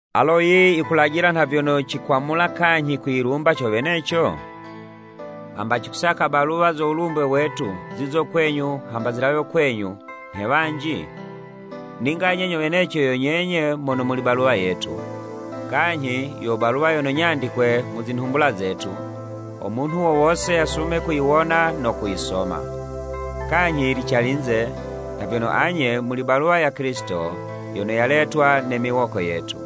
Alo yiyi yikulajila nha vyono cikwamula kanyhi kwiyilumba co weneco? Hamba cikusaka baluwa zo wulumbwe wetu zizo kwenyu hamba zilawe kwenyu, nhe wanji? Ninga anye nyo weneco yo nyenye mono muli baluwa yetu, kanyhi yo baluwa yono nyandikwe mu zinhumbula zetu, ho munhu wo wose yasume kuyiwona no kuyisoma. Kanyhi yili calinze, nha vyono anye muli baluwa ya Kilisito yono yaletwa ne miwoko yetu.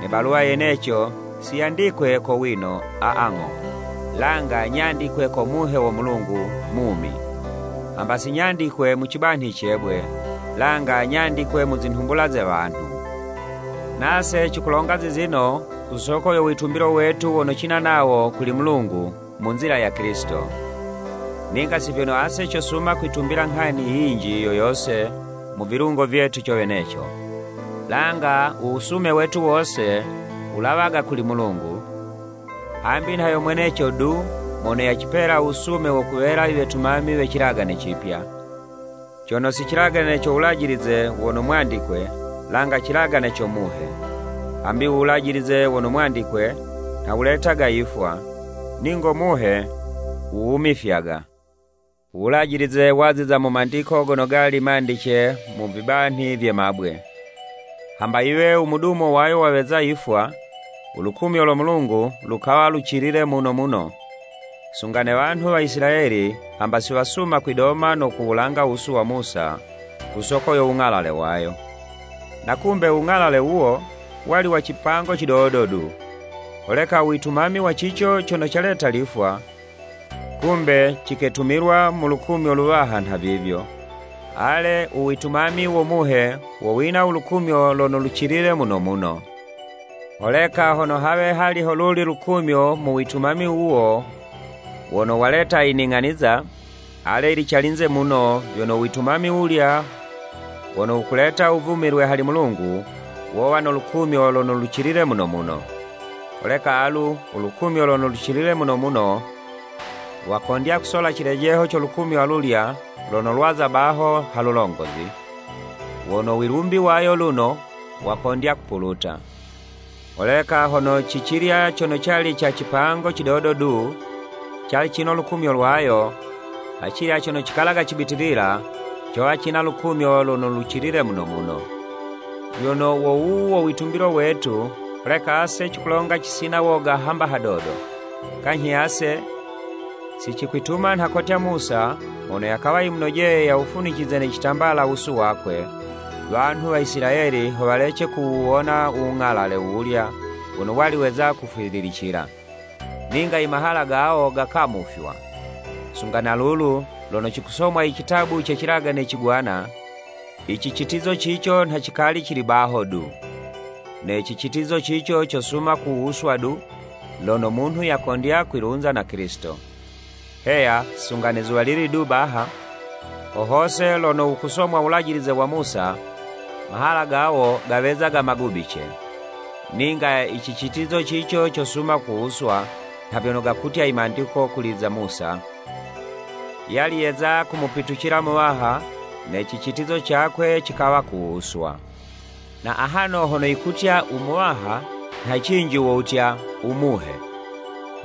Ne baluwa yeneco siyandikwe ko wino, aa ng'o, langa nyandikwe ko Muhe wo Mulungu mumi, hamba si nyandikwe mu cibanhi ce'bwe, langa nyandikwe mu zinhumbula ze wanhu. Nase cikulonga zizino ku soko yo witumbilo wetu wono cina nawo kuli Mulungu mu nzila ya Kilisito. Ninga si vyono ase cosuma kwitumila nghani yinji yo yose mu vilungo vyetu co weneco, langa u wusume wetu wose, wulawaga kuli Mulungu, hambi nha yo mweneco du mono yacipela u wusume wo kuwela i wetumami we cilagane Cipya, cono si cilagane co wulajilize wono mwandikwe, langa Cilagane co Muhe. Hambi u wulajilize wono mwandikwe, nha wuletaga yifwa, ningo Muhe, wuwumifyaga. U Wulajilize waziza mu mandiko gono gali mandice mu vibanhi vye mabwe. Hamba yiwe u mudumo wayo waweza yifwa, u lukumyo lo Mulungu lukawa lucilile muno muno, sunga ne wanhu wa Isilayeli hamba siwasuma kwidoma no kuwulanga wusu wa Musa ku soko yo wung'alale wayo. Na kumbe u wung'ale wuwo, wali wa cipango cidodo du. Holeka u witumami wa cico cono caleta lifwa, kumbe ciketumilwa mu lukumyo luwaha nhavivyo, ale, uwitumami wo Muhe, wo wina ulukumyo lono lucilile muno muno. Holeka hono hawe hali howuli lukumyo mu witumami wuwo wono waleta i ning'aniza, ale, yili calinze muno, vyono u witumami wulya wono wukuleta u wuvumilwe hali Mulungu, wowa no lukumyo lono lucilile muno muno. Holeka alu, ulukumyo lono lucilile muno muno, lwakondya kusola cilejeho co lukumyo alulya lono lwaza baho ha lulongozi, wono wilumbi wayo luno, wakondya kupuluta. Holeka hono ci cilya cono cali ca cipango cidodo du, cali cino lukumyo lwayo, acilya cono cikalaga cibitilila, cowa cina lulumyo lono lucilile muno muno. Vyono wo wuwu wo witumbilo wetu, holeka ase cikulonga cisina woga hamba hadodo. Kanyhi ase, si cikwituma nha kotya Musa mono yakawa yimunojeye yawufunicize ne citambala wusu wakwe, wanhu wa Isilayeli ho walece kuwuwona u wung'alale wuwulya wono wali weza kufwililicila. Ninga i mahala gawo gakamufywa. Sunga na lulu, lono cikusomwa i citabu ce Cilagane Cigwana, i cicitizo cico nha cikali cili baho du. Ne cicitizo cico cosuma kuwuswa du, lono munhu yakondya kwilunza na Kilisito. Heya, sunga ne zuwalili du baha, ho hose lono wukusomwa Wulajilize wa Musa, mahala gawo gawezaga magubice. Ninga i cicitizo cico cosuma kuwuswa, nha vyono gakutya i mandiko kuli za Musa, “Yali yeza kumupitucila Muwaha, ne cicitizo cakwe cikawa kuwuswa.” Na ahano hono yikutya “U Muwaha,” nha cinji wo wutya, “U Muhe,”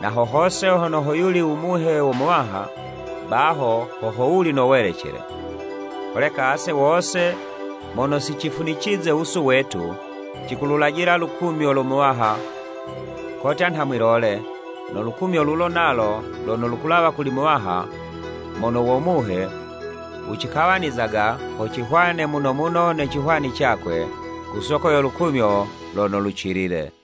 na ho hose hono ho yuli u Muhe wo Muwaha, baho ho ho wuli no welecele. Holeka ase wose mono si cifunicize wusu wetu, cikululajila lukumyo lo Muwaha kotya nha mwi'lole, no lukumyo lulo nalo lono lukulawa kuli Muwaha, mono wo Muhe, wucikawanizaga ho cihwane muno muno ne cihwani cakwe, ku so lukumyo lono lucilile.